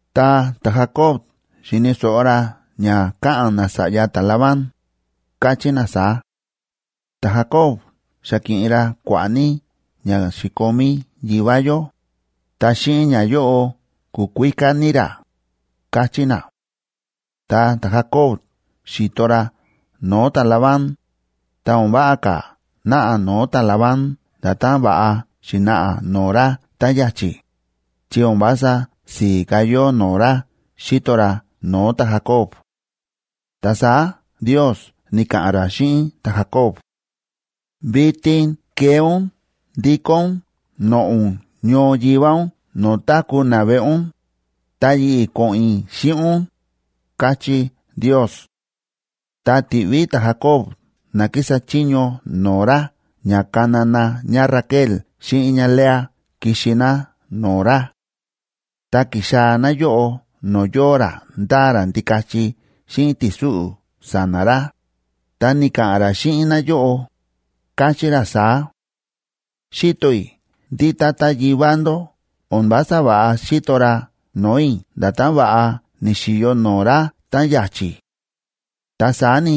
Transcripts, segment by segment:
Ta ta̱Jacob xi̱ni̱ so̱ꞌo ra ña káꞌa̱n nasa̱ꞌya ta̱Labán, káchí na saá: “Ta̱Jacob xa ki̱ꞌin ra kua̱ꞌa̱ ní ña xi̱komí yivá yó, ta xíꞌin ñayóꞌo ku̱kuíká ní ra”, káchí na. Ta ta̱Jacob xi̱to ra no̱o̱ ta̱Labán, ta o̱n váꞌa ka̱ náꞌa no̱o̱ ta̱Labán nda̱tán va̱ꞌa xi̱naꞌa no̱o̱ ra tá ya̱chi̱, chi o̱n vása si̱i̱ ka̱ yóo no̱o̱ ra xíto ra no̱o̱ ta̱Jacob. Ta saá Ndiosa ni̱ka̱ꞌa̱n ra xíꞌin ta̱Jacob: ―Vitin kee ún ndikó ún noꞌo̱ ún ñoo yivá ún no̱o̱ táku̱ naveꞌe ún, ta yi̱ꞌi̱ ko̱ꞌo̱n i̱ xíꞌin ún ―káchí Ndios. Ta ti̱ꞌví ta̱Jacob na kísa chiño no̱o̱ ra ña kana na ñáRaquel xíꞌin ñáLea kixi ná no̱o̱ ra. Ta ki̱xaa̱ náyóꞌo no̱o̱ yóo ra ndáa ra ndikachi xíꞌin ti̱súꞌu̱ sa̱na̱ ra, ta ni̱ka̱ꞌa̱n ra xíꞌin náyóꞌo, káchí ra saá: ―Xíto i̱ ndí tata yivá ndó o̱n vása va̱ꞌa xíto ra no̱o̱ i̱ nda̱tán va̱ꞌa ni̱xi̱yo no̱o̱ ra táꞌan ya̱chi̱. Ta saá ni,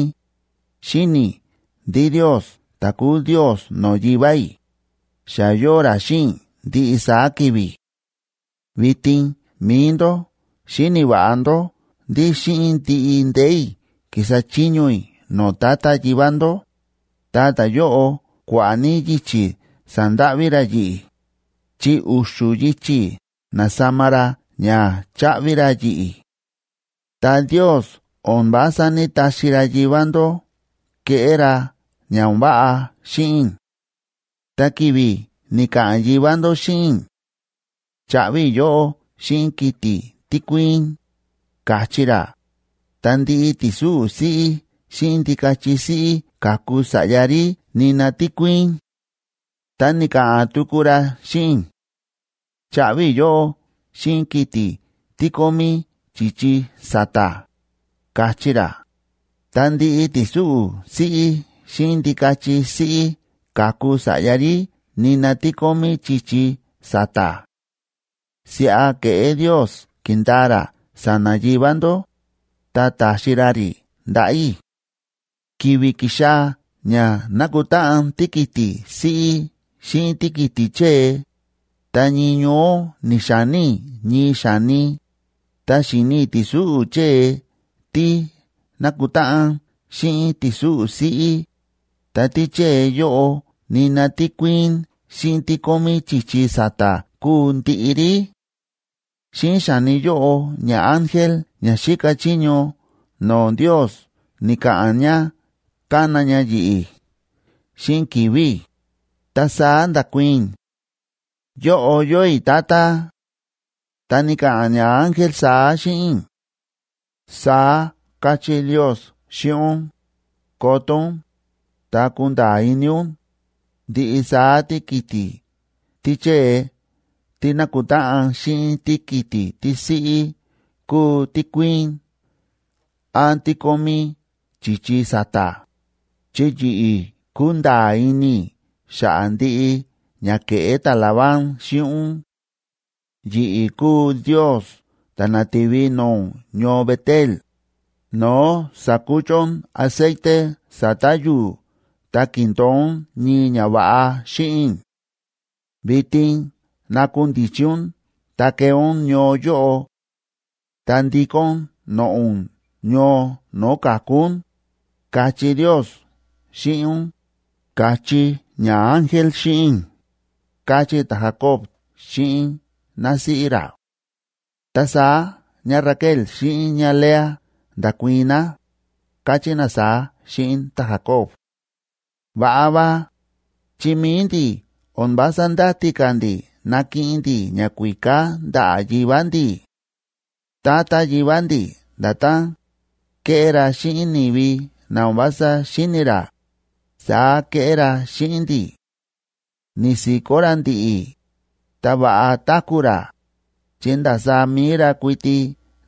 xíni̱ i̱ ndí Ndios ta̱ kúu Ndios no̱o̱ yivá i̱, xa yóo ra xíꞌin i̱ ndiꞌi saá ki̱vi̱. Vitin mi̱i ndó xíni̱ va̱ꞌa ndó ndí xíꞌin ndiꞌi ndee̱ i̱ ki̱sa chiño i̱ no̱o̱ tata yivá ndó, ta ta̱yóꞌo kua̱ꞌa̱ ní yichi̱ sa̱ndáꞌví ra yi̱ꞌi̱, chi u̱xu̱ yichi̱ na̱sama ra ña cháꞌvi ra yi̱ꞌi̱. Ta Ndios o̱n vása ní‑taxi ra yivá ndó keꞌé ra ña o̱n váꞌa xíꞌin i̱. Ta ki̱vi̱ ni̱ka̱ꞌa̱n yivá ndó xíꞌin i̱: “Chaꞌvi i̱ yóꞌó xíꞌin kiti̱ tí kuíín”, ka̱chí ra, ta ndiꞌi ti̱súꞌu̱ siꞌí xíꞌin ndikachi siꞌí ka̱ku sa̱ꞌya rí nina tí kuíín. Tá ni̱ka̱ꞌa̱n tuku ra xíꞌin i̱: “Chaꞌvi i̱ yóꞌó xíꞌin kiti̱ tí kómí chi̱chi sa̱ta̱”, ka̱chí ra, ta ndiꞌi ti̱súꞌu̱ siꞌí xíꞌin ndikachi siꞌí ka̱ku sa̱ꞌya rí nina tí kómí chi̱chi sa̱ta̱. Siꞌa ke̱ꞌé Ndios ki̱ndaa ra sa̱na̱ yivá ndó, ta ta̱xi ra rí ndaꞌa̱ i̱. ’Ki̱vi̱ ki̱xaa̱ ña nákutáꞌan tíkiti̱ siꞌí xíꞌin tíkiti̱ chée, ta ñii ñoó ni̱xa̱ní i̱ ñii xa̱ni, ta xi̱ni i̱ ti̱súꞌu̱ chée tí nákutáꞌan xíꞌin ti̱súꞌu̱ siꞌí, ta tíchée yóꞌo nina tí kuíín xíꞌin tí kómí chi̱chi sa̱ta̱ kúu ndiꞌi rí. Xíꞌin xa̱ni yóꞌo ñaángel ña xíka chiño no̱o̱ Ndios ni̱ka̱ꞌa̱n ña kána ña yi̱ꞌi̱ xíꞌin ki̱vi̱ i̱, ta saá nda̱kuii̱n i̱: “Yóꞌo yóo i̱, tata.” Ta ni̱ka̱ꞌa̱n ñaángel saá xíꞌin i̱: “Saá káchí Ndios xíꞌin ún: Koto ún, ta kunda̱a̱ ini ún, ndiꞌi saá tíkiti̱ tíchée tí nákutáꞌan xíꞌin tíkiti̱ tísiꞌí kúu tí kuíín án tí kómí chi̱chi sa̱ta̱, chi yi̱ꞌi̱ kúnda̱a̱ ini i̱ xa̱ꞌa̱ ndiꞌi ña ke̱ꞌé ta̱Labán xíꞌin ún. Yi̱ꞌi̱ kúu Ndios ta̱ na̱ti̱vi no̱o̱ ún ñoo Bet‑el, no̱o̱ sa̱kuchu ún aceite sa̱ta̱ yu̱u̱ ta ki̱ndo̱o ún ñii ñava̱ꞌa xíꞌin i̱. Vitin nakundichi ún ta kee ún ñoo yóꞌo; ta ndikó ún noꞌo̱ ún ñoo no̱o̱ ka̱ku ún, káchí Ndios xíꞌin ún”, ka̱chí ñaángel xíꞌin i̱ ―káchí ta̱Jacob xíꞌin násíꞌí ra. Ta saá ñáRaquel xíꞌin ñáLea nda̱kuii̱n ná, káchí ná saá xíꞌin ta̱Jacob: ―Va̱ꞌa va, chi mi̱i ndi̱ o̱n vása ndáti ka̱ ndi̱ nakiꞌin ndi̱ ñakuíká ndaꞌa̱ yivá ndi̱. Tata yivá ndi̱ nda̱tán kéꞌé ra xíꞌin ni̱vi na o̱n vása xíni̱ ra, saá kéꞌé ra xíꞌin ndi̱. Ni̱si̱kó ra ndi̱ꞌi̱, ta va̱ꞌa táku̱ ra, chi ndasaá mi̱i ra kuiti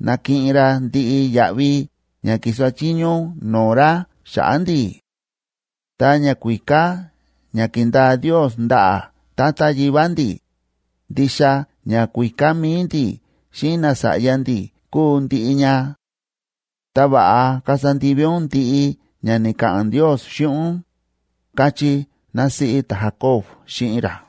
na̱kiꞌin ra ndiꞌi yaꞌvi ña ki̱sa chiño ún no̱o̱ ra xa̱ꞌa̱ ndi̱. Ta ñakuíká ña ki̱ndaa Ndios ndaꞌa̱ tata yivá ndi̱, ndixa ñakuíká mi̱i ndi̱ xíꞌin nasa̱ꞌya ndi̱ kúu ndiꞌi ña. Ta va̱ꞌa kasa ndivi ún ndiꞌi ña ni̱ka̱ꞌa̱n Ndios xíꞌin ún ―káchí násíꞌí ta̱Jacob xíꞌin ra.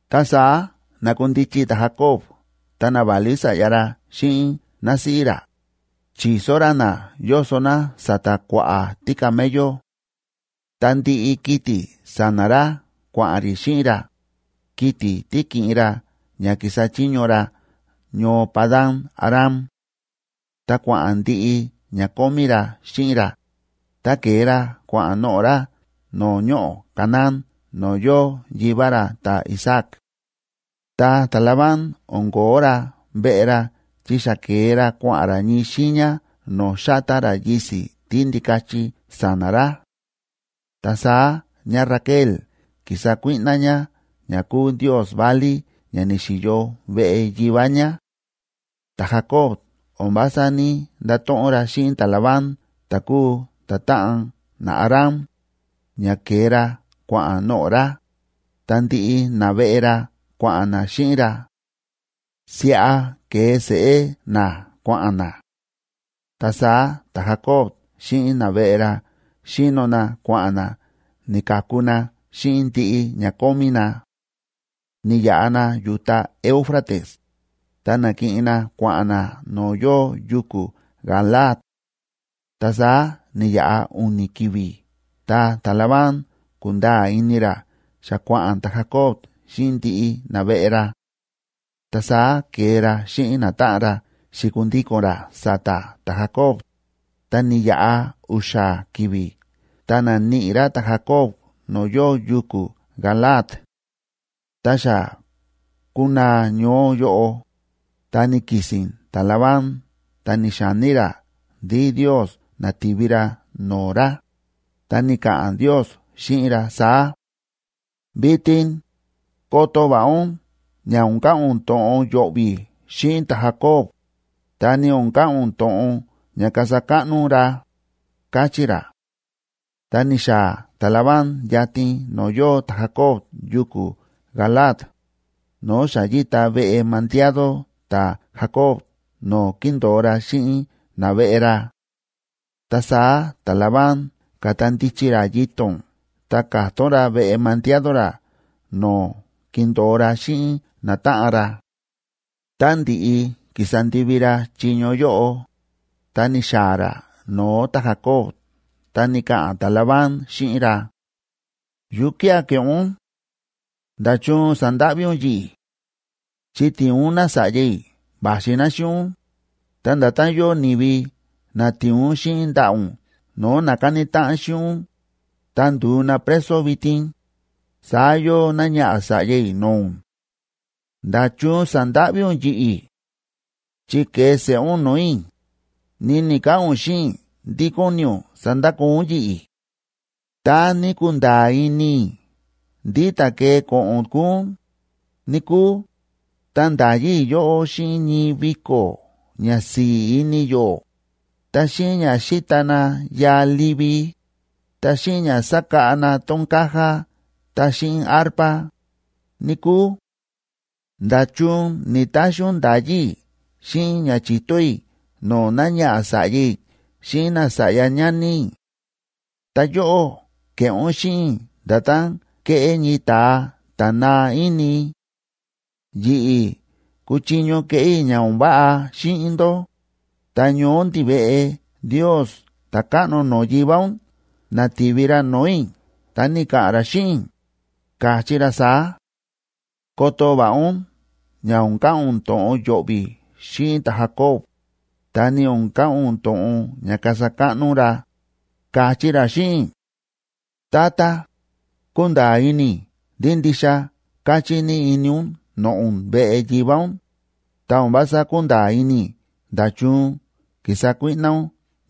Ta saá na̱kundichi ta̱Jacob ta naválí sa̱ꞌya ra xíꞌin násíꞌí ra, chi̱so ra na yóso na sa̱ta̱ kua̱ꞌa̱ tícamello. Ta ndiꞌi kiti̱ sa̱na̱ ra kua̱ꞌa̱n rí xíꞌin ra, kiti̱ tí ki̱ꞌin ra ña ki̱sa chiño ra ñoo Padan‑aram. Ta kua̱ꞌa̱n ndiꞌi ña kómí ra xíꞌin ra, ta ke̱e ra kua̱ꞌa̱n noꞌo̱ ra no̱o̱ ñoꞌo̱ Canaán no̱o̱ yóo yivá ra ta̱Isaac. Ta ta̱Labán o̱n ko̱ó ra veꞌe ra chi xa ke̱e ra kua̱ꞌa̱n ra ñii xiiña no̱o̱ xátá ra yisi̱ tíndikachi sa̱na̱ ra. Ta saá ñáRaquel ki̱sa kuíꞌná ñá ña kúu ndios válí ña ni̱xi̱yo veꞌe yivá ñá. Ta̱Jacob o̱n vása ní‑ndato̱ꞌon ra xíꞌin ta̱Labán ta̱ kúu ta̱táꞌan naAram, ña ke̱e ra kua̱ꞌa̱n noꞌo̱ ra, ta ndiꞌi naveꞌe ra kua̱ꞌa̱n na xíꞌin ra; siꞌa ke̱e seꞌé na kua̱ꞌa̱n na. Ta saá ta̱Jacob xíꞌin naveꞌe ra xíno na kua̱ꞌa̱n na ni̱ka̱ku na xíꞌin ndiꞌi ña kómí na. Ni̱yaꞌa na yu̱ta Éufrates, ta na̱kiꞌin na kua̱ꞌa̱n na no̱o̱ yóo yuku̱ Galaad. Ta saá ni̱yaꞌa u̱ni̱ ki̱vi̱ ta ta̱Labán ku̱nda̱a̱ ini ra xa kua̱ꞌa̱n ta̱Jacob xíꞌin ndiꞌi naveꞌe ra. Ta saá ke̱e ra xíꞌin natáꞌan ra xi̱kundiko̱n ra sa̱ta̱ ta̱Jacob, ta ni̱yaꞌa u̱xa̱ ki̱vi̱ ta na̱níꞌi ra ta̱Jacob no̱o̱ yóo yuku̱ Galaad. Tá xa ku̱naa ñoó yóꞌo, ta ni̱ki̱si̱n ta̱Labán ta ni̱xa̱ní ra ndí Ndios na̱ti̱vi ra no̱o̱ ra, ta ni̱ka̱ꞌa̱n Ndios xíꞌin ra saá: “Vitin koto va̱ꞌa ún ña o̱n ka̱ꞌa̱n ún to̱ꞌon yo̱ꞌvi̱ xíꞌin ta̱Jacob, ta ni o̱n ka̱ꞌa̱n ún to̱ꞌon ña kasa káꞌno ún ra”, káchí ra. Ta ni̱xaa̱ ta̱Labán yatin no̱o̱ yóo ta̱Jacob yuku̱ Galaad, no̱o̱ xa yíta veꞌe mandiado ta̱Jacob no̱o̱ kíndo̱o ra xíꞌin naveꞌe ra. Ta saá ta̱Labán ka̱ta ndichi ra yito̱n ta ka̱tón ra veꞌe mandiado ra no̱o̱ kindo̱o ra xíꞌin natáꞌan ra. Tá ndi̱ꞌi ki̱sa ndivi ra chiño yóꞌo, ta ni̱xaa̱ ra no̱o̱ ta̱Jacob ta ni̱ka̱ꞌa̱n ta̱Labán xíꞌin ra: ―¿Yukía̱ ke̱ꞌé ún? ¿Nda̱chun sa̱ndáꞌví ún yi̱ꞌi̱? Chi ti̱in ún nása̱ꞌya i̱ va̱xi ná xíꞌin ún, ta nda̱tán yóo ni̱vi na ti̱in ún xíꞌin ndaꞌa̱ ún no̱o̱ na ka̱ni táꞌan xíꞌin ún, ta ndu̱u na preso vitin, saá yóo náñaꞌa̱ sa̱ꞌya i̱ no̱o̱ ún. ¿Nda̱chun sa̱ndáꞌví ún yi̱ꞌi̱? Chi ke̱e seꞌé ún no̱o̱ i̱, ni ni̱‑kaꞌa̱n ún xíꞌin i̱ ndí kóni ún sandakoo ún yi̱ꞌi̱. Tá ní kunda̱a̱ ini i̱ ndí ta̱ kee ko̱ꞌo̱n kuu ún, níkúu, ta nda̱yi i̱ yóꞌó xíꞌin ñii viko̱ ña si̱i̱ ini yó, ta xíꞌin ña xíta na yaa livi, ta xíꞌin ña sákáꞌa na tón caja ta xíꞌin arpa, níkúu. ¿Nda̱chun ni̱‑taxi ún nda̱yí i̱ xíꞌin ña chi̱to i̱ no̱o̱ náñaꞌa̱ sa̱ꞌya i̱ xíꞌin nasa̱ꞌya ñani i̱? Ta yóꞌó ke̱ꞌé ún xíꞌin i̱ nda̱tán kéꞌé ñii ta̱a ta̱ naa ini. Yi̱ꞌi̱ kuchiño keꞌé i̱ ña o̱n váꞌa xíꞌin ndó, ta ñoó ndiveꞌe Ndios ta̱káꞌno no̱o̱ yivá ún na̱ti̱vi ra no̱o̱ i̱, ta ni̱ka̱ꞌa̱n ra xíꞌin i̱, ka̱chí ra saá: “Koto va̱ꞌa ún ña o̱n ka̱ꞌa̱n ún to̱ꞌon yo̱ꞌvi̱ xíꞌin ta̱Jacob, ta ni o̱n ka̱ꞌa̱n ún to̱ꞌon ña kasa káꞌno ún ra”, ka̱chí ra xíꞌin i̱. Tata, kúnda̱a̱ ini i̱ ndí ndixa káchí ní ini ún noꞌo̱ ún veꞌe yivá ún, ta o̱n vása kúnda̱a̱ ini i̱ nda̱chun ki̱sa kuíꞌná ún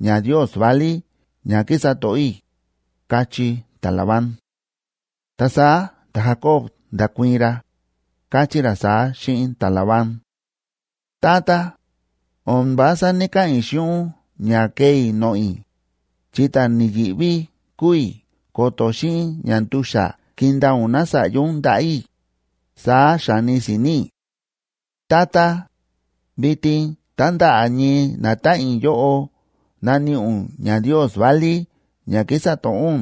ñandios válí ña kísa to̱ꞌó i̱ ―káchí ta̱Labán. Ta saá ta̱Jacob nda̱kuii̱n ra, káchí ra saá xíꞌin ta̱Labán: ―Tata, o̱n vása ní‑kaꞌa̱n i̱ xíꞌin ún ña kee i̱ noꞌo̱ i̱, chi ta̱ ni̱yi̱ꞌví kúu i̱ ko̱to̱ xíꞌin ñandu̱xa̱ kindaa ún nása̱ꞌya ún ndaꞌa̱ i̱, saá xa̱ni si̱ni̱ i̱. Tata, vitin tá ndaꞌa̱ ñii natáꞌan i̱ yóꞌo naníꞌi ún ñandios válí ña kísa to̱ꞌó ún,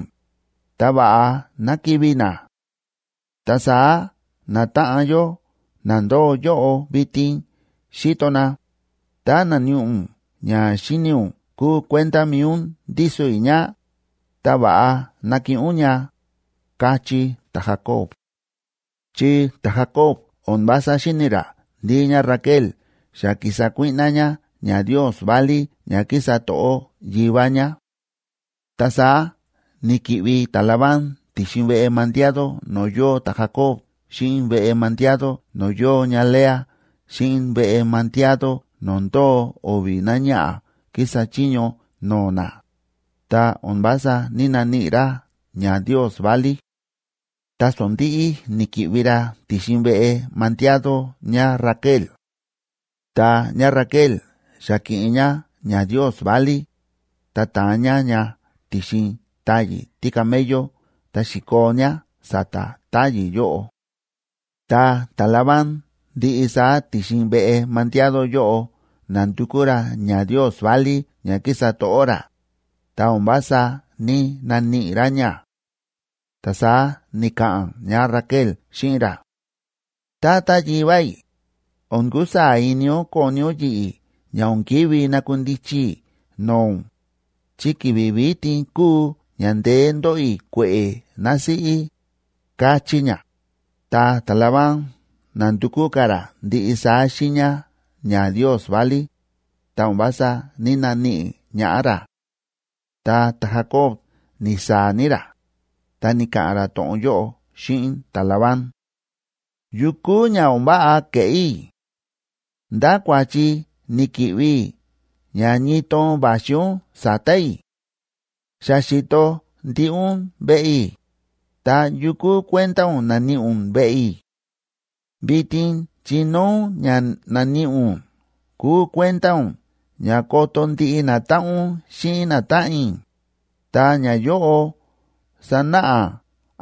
ta va̱ꞌa ná kivi̱ na. Ta saá natáꞌan yó na ndóo yóꞌo vitin xíto na, tá naníꞌi ún ña xíni̱ ún kúu kuenda mi̱i ún ndíso i̱ ña, ta va̱ꞌa nakiꞌin ún ña ―káchí ta̱Jacob. Chi ta̱Jacob o̱n vása xíni̱ ra ndí ñáRaquel xa ki̱sa kuíꞌná ñá ñandios válí ña kísa to̱ꞌó yivá ñá. Ta saá ni̱ki̱ꞌvi ta̱Labán ti̱xin veꞌe mandiado no̱o̱ yóo ta̱Jacob xíꞌin veꞌe mandiado no̱o̱ yóo ñáLea xíꞌin veꞌe mandiado no̱o̱ ndóo o̱vi̱ náñaꞌa̱ kísa chiño no̱o̱ na, ta o̱n vása ní‑naníꞌi ra ñandios válí. Ta sondi̱ꞌi ni̱ki̱ꞌvi ra ti̱xin veꞌe mandiado ñáRaquel. Ta ñáRaquel xa ki̱ꞌin ñá ñandios válí, ta ta̱an ñá ña ti̱xin táyi̱ tícamello ta xi̱koo ñá sa̱ta̱ táyi̱ yóꞌo. Ta ta̱Labán ndiꞌi saá ti̱xin veꞌe mandiado yóꞌo na̱ndukú ra ñandios válí ña kísa to̱ꞌó ra, ta o̱n vása ní‑naníꞌi ra ña. Ta saá ni̱ka̱ꞌa̱n ñáRaquel xíꞌin ra: ―Tata yivá i̱, o̱n kusaa̱ ini ún koni ún yi̱ꞌi̱ ña o̱n ki̱ví nakundichi i̱ no̱o̱ ún, chi ki̱vi̱ vitin kúu ña ndeé ndóꞌo i̱ kue̱ꞌe̱ násíꞌí ―káchí ñá. Ta ta̱Labán na̱ndukú ka̱ ra ndiꞌi saá xiiña ñandios válí, ta o̱n vása ní‑naníꞌi ñaꞌá ra. Ta ta̱Jacob ni̱saa̱ ní ra, ta ni̱ka̱ꞌa̱n ra to̱ꞌon yóꞌo xíꞌin ta̱Labán: ―¿Yukú ña o̱n váꞌa ke̱ꞌé i̱? ¿Ndá kua̱chi ni̱ki̱ꞌvi i̱ ña ñii toon va̱xi ún sa̱ta̱ i̱? Xa xi̱to ndiꞌi ún veꞌe i̱, ta, ¿yukú kuenda ún na̱níꞌi ún veꞌe i̱? Vitin chinóo ún ña na̱níꞌi ún kúu kuenda ún ña koto ndiꞌi natáꞌan ún xíꞌin natáꞌan i̱, ta ñayóꞌo sanáꞌa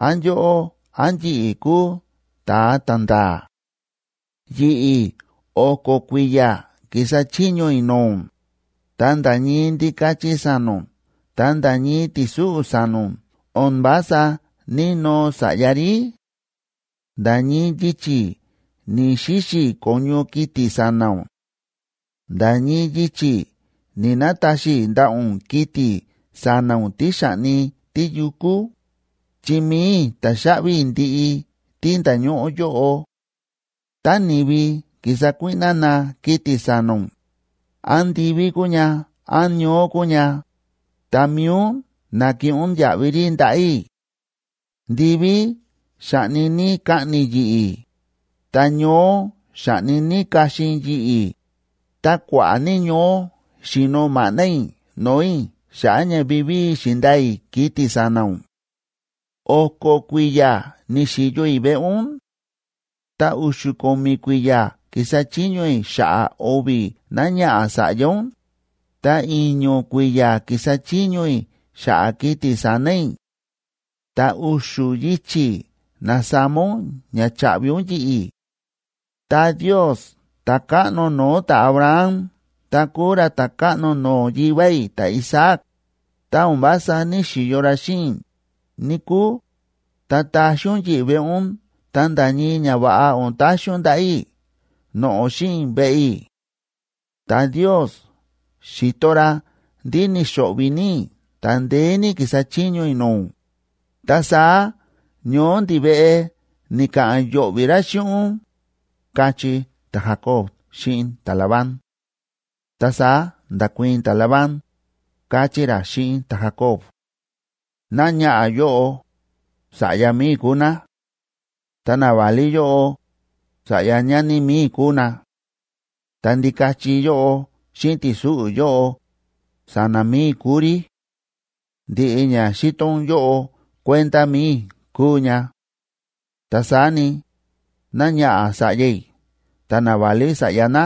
án yóꞌó án yi̱ꞌi̱ kúu ta̱a ta̱nda̱a̱. Yi̱ꞌi̱ o̱ko̱ kui̱ya̱ ki̱sa chiño i̱ no̱o̱ ún, ta nda̱ ñii ndikachi sa̱na̱ ún ta nda̱ ñii ti̱súꞌu̱ sa̱na̱ ún o̱n vása ní‑noo sa̱ꞌya rí; nda̱ ñii yichi̱ ni̱‑xixi i̱ ko̱ñu kiti̱ sa̱na̱ ún; nda̱ ñii yichi̱ ni̱‑nataxi i̱ ndaꞌa̱ ún kiti̱ sa̱na̱ ún tí xa̱ꞌni tíyukú, chi mi̱i i̱ ta̱xaꞌvi i̱ ndiꞌi tí nda̱ñóꞌó yóꞌo; tá ni̱vi ki̱sa kuíꞌná na kiti̱ sa̱na̱ ún, án ndiví kúu ña án ñoó kúu ña, ta mi̱i ún na̱kiꞌin ún yaꞌvi rí ndaꞌa̱ i̱. Ndiví xáꞌni ní kaꞌni̱ yi̱ꞌi̱, ta ñoó xáꞌni ní kaxin yi̱ꞌi̱, ta kua̱ꞌa̱ ní ñoó xíno maꞌná i̱ no̱o̱ i̱ xa̱ꞌa̱ ña vivíi xi̱ndaa i̱ kiti̱ sa̱na̱ ún. O̱ko̱ kui̱ya̱ ni̱xi̱yo i̱ veꞌe ún; ta u̱xu̱ ko̱mi̱ kui̱ya̱ ki̱sa chiño i̱ xa̱ꞌa̱ o̱vi̱ náñaꞌa̱ sa̱ꞌya ún, ta i̱ño̱ kui̱ya̱ ki̱sa chiño i̱ xa̱ꞌa̱ kiti̱ sa̱na̱ i̱; ta u̱xu̱ yichi̱ na̱sama ún ña cháꞌvi ún yi̱ꞌi̱. Ta Ndios ta̱káꞌno no̱o̱ ta̱Abraham ta kúu ra ta̱káꞌno no̱o̱ yivá i̱ ta̱Isaac, tá o̱n vása ní‑xiyo ra xíꞌin i̱, níkúu, ta taxín ún yi̱ꞌi̱ veꞌe ún ta nda̱ ñii ñava̱ꞌa o̱n taxi ún ndaꞌa̱ i̱ noꞌo̱ xíꞌin i̱ veꞌe i̱. Ta Ndios xi̱to ra ndí ni̱xo̱ꞌvi̱ ní i̱ ta ndeé ní ki̱sa chiño i̱ no̱o̱ ún, ta saá ñoó ndiveꞌe ni̱ka̱ꞌa̱n yo̱ꞌvi̱ ra xíꞌin ún ―káchí ta̱Jacob xíꞌin ta̱Labán. Ta saá nda̱kuii̱n ta̱Labán, káchí ra xíꞌin ta̱Jacob: ―Náñaꞌa̱ yóꞌo, sa̱ꞌya mi̱i i̱ kúu ná. Ta naválí yóꞌo, sa̱ꞌya ñani mi̱i i̱ kúu na. Ta ndikachi yóꞌo xíꞌin ti̱súꞌu̱ yóꞌo, sa̱na̱ mi̱i i̱ kúu rí. Ndiꞌi ña xíto ún yóꞌo kuenda mi̱i i̱ kúu ña. Ta saá ni, náñaꞌa̱ sa̱ꞌya i̱ ta naválí sa̱ꞌya ná,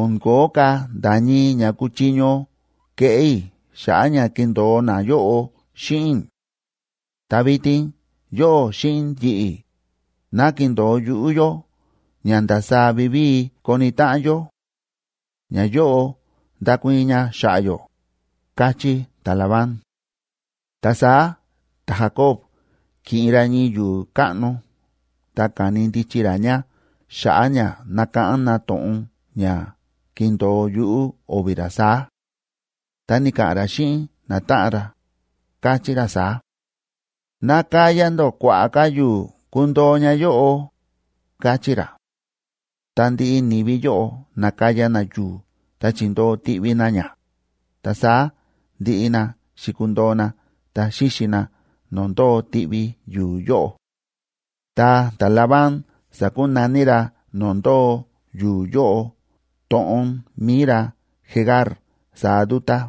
o̱n ko̱ó ka̱ nda̱ ñii ña kúchiño keꞌé i̱ xa̱ꞌa̱ ña kindo̱o nayóꞌo xíꞌin i̱. Ta vitin yóꞌó xíꞌin yi̱ꞌi̱, ná kindo̱o yuꞌú yó ña ndasaá vivíi koni táꞌan yó. Ñayóꞌo ndakuii̱n ña xa̱ꞌa̱ yó ―káchí ta̱Labán. Ta saá ta̱Jacob ki̱ꞌin ra ñii yu̱u̱ káꞌno ta ka̱ni ndichi ra ña xa̱ꞌa̱ ña nakáꞌán na to̱ꞌon ña kindo̱o yuꞌú o̱vi̱ ra saá. Ta ni̱ka̱ꞌa̱n ra xíꞌin natáꞌan ra, káchí ra saá: ―Nakaya ndó kua̱ꞌa̱ ka̱ yu̱u̱ kundo̱o ña yóꞌo ―káchí ra. Ta ndiꞌi ni̱vi yóꞌo na̱kaya na yu̱u̱ ta chi̱ndoo tiꞌvi na ña, ta saá ndiꞌi na xi̱kundo̱o na ta xíxi na no̱o̱ ndóo tiꞌvi yu̱u̱ yóꞌo. Ta ta̱Labán sa̱kunaní ra no̱o̱ ndóo yu̱u̱ yóꞌo to̱ꞌon mi̱i ra Jegar Sahaduta,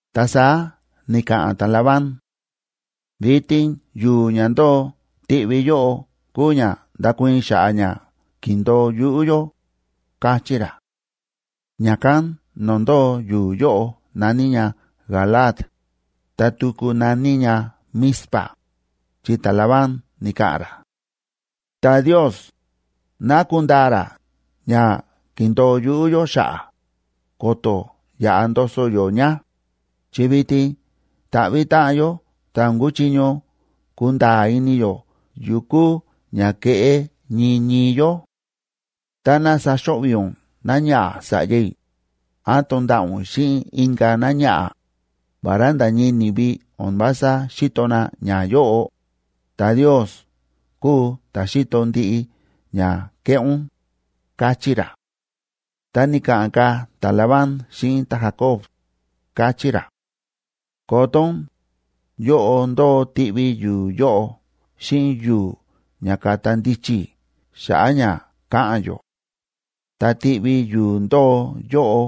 Ta saá ni̱ka̱ꞌa̱n ta̱Labán: ―Vitin yu̱u̱ ña ndóo tiꞌvi yóꞌo kúu ña ndakuii̱n xa̱ꞌa̱ ña ki̱ndo̱o yuꞌú yó ―káchí ra. Ña̱kán no̱o̱ ndóo yu̱u̱ yóꞌo na̱ní ña Galaad, ta tuku na̱ní ña Mizpa,c chi ta̱Labán ni̱ka̱ꞌa̱n ra: ―Ta Ndios, ná kundaa ra ña ki̱ndo̱o yuꞌú yó xa̱ꞌa̱, ko̱to̱ yaꞌa ndoso yó ña, chi vitin ta̱ꞌvi̱ táꞌan yó ta o̱n kuchiño kunda̱a̱ ini yó yukú ña keꞌé ñii ñii yó. Táná saxo̱ꞌvi̱ ún náñaꞌa̱ sa̱ꞌya i̱, án tonda̱ꞌa̱ ún xíꞌin inka̱ náñaꞌa̱, vará nda̱ ñii ni̱vi o̱n vása xíto na ñayóꞌo, ta Ndios kúu ta̱ xíto ndiꞌi ña kéꞌé ún ―káchí ra. Ta ni̱ka̱ꞌa̱n ka̱ ta̱Labán xíꞌin ta̱Jacob, káchí ra: ―Koto ún, yóꞌo ndóo tiꞌvi yu̱u̱ yóꞌo xíꞌin yu̱u̱ ña ka̱ta ndichi i̱ xa̱ꞌa̱ ña káꞌa̱n yó. Ta tiꞌvi yu̱u̱ ndóo yóꞌo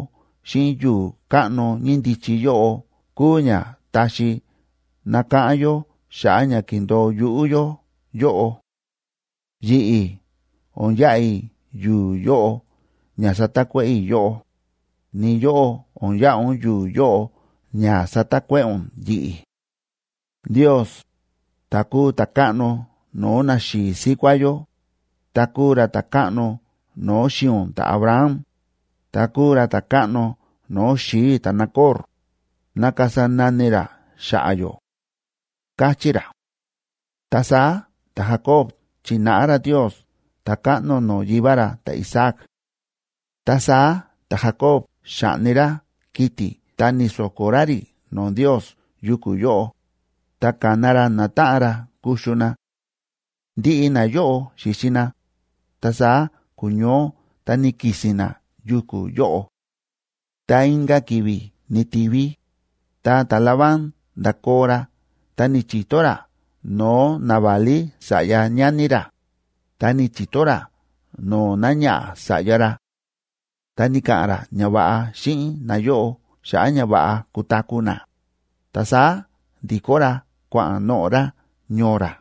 xíꞌin yu̱u̱ káꞌno ñíndichi yóꞌo kúu ña taxi nakáꞌán yó xa̱ꞌa̱ ña ki̱ndo̱o yuꞌú yó yóꞌo. Yi̱ꞌi̱ o̱n yaꞌa i̱ yu̱u̱ yóꞌo ña satakuéꞌe̱ i̱ yóꞌó, ni yóꞌó o̱n yaꞌa ún yu̱u̱ yóꞌo ña satakuéꞌe̱ ún yi̱ꞌi̱. Ndios, ta̱ kúu ta̱káꞌno no̱o̱ naxi̱i̱ síkuá yó, ta kúu ra ta̱káꞌno no̱o̱ xi̱i̱ ún ta̱Abraham, ta kúu ra ta̱káꞌno no̱o̱ xi̱i̱ i̱ ta̱Nacor, ná kasa nani ra xa̱ꞌa̱ yó ―káchí ra. Ta saá ta̱Jacob chi̱náꞌa ra Ndios ta̱káꞌno no̱o̱ yivá ra ta̱Isaac. Ta saá ta̱Jacob xa̱ꞌni ra kiti̱ ta ni̱so̱ko̱ ra rí no̱o̱ Ndios yuku̱ yóꞌo, ta ka̱na ra natáꞌan ra kuxu na. Ndiꞌi nayóꞌo xi̱xi na, ta saá ku̱ñoó ta ni̱ki̱si̱n na yuku̱ yóꞌo. Ta inka̱ ki̱vi̱ ni̱ti̱vi, ta ta̱Labán nda̱koo ra ta ni̱chi̱to ra no̱o̱ naválí sa̱ꞌya ñani ra, ta ni̱chi̱to ra no̱o̱ náñaꞌa̱ sa̱ꞌya ra; ta ni̱ka̱ꞌa̱n ra ñava̱ꞌa xíꞌin nayóꞌo xa̱ꞌa̱ ña va̱ꞌa kutaku̱ na, ta saá ndi̱kó ra kua̱ꞌa̱n noꞌo̱ ra ñoo ra.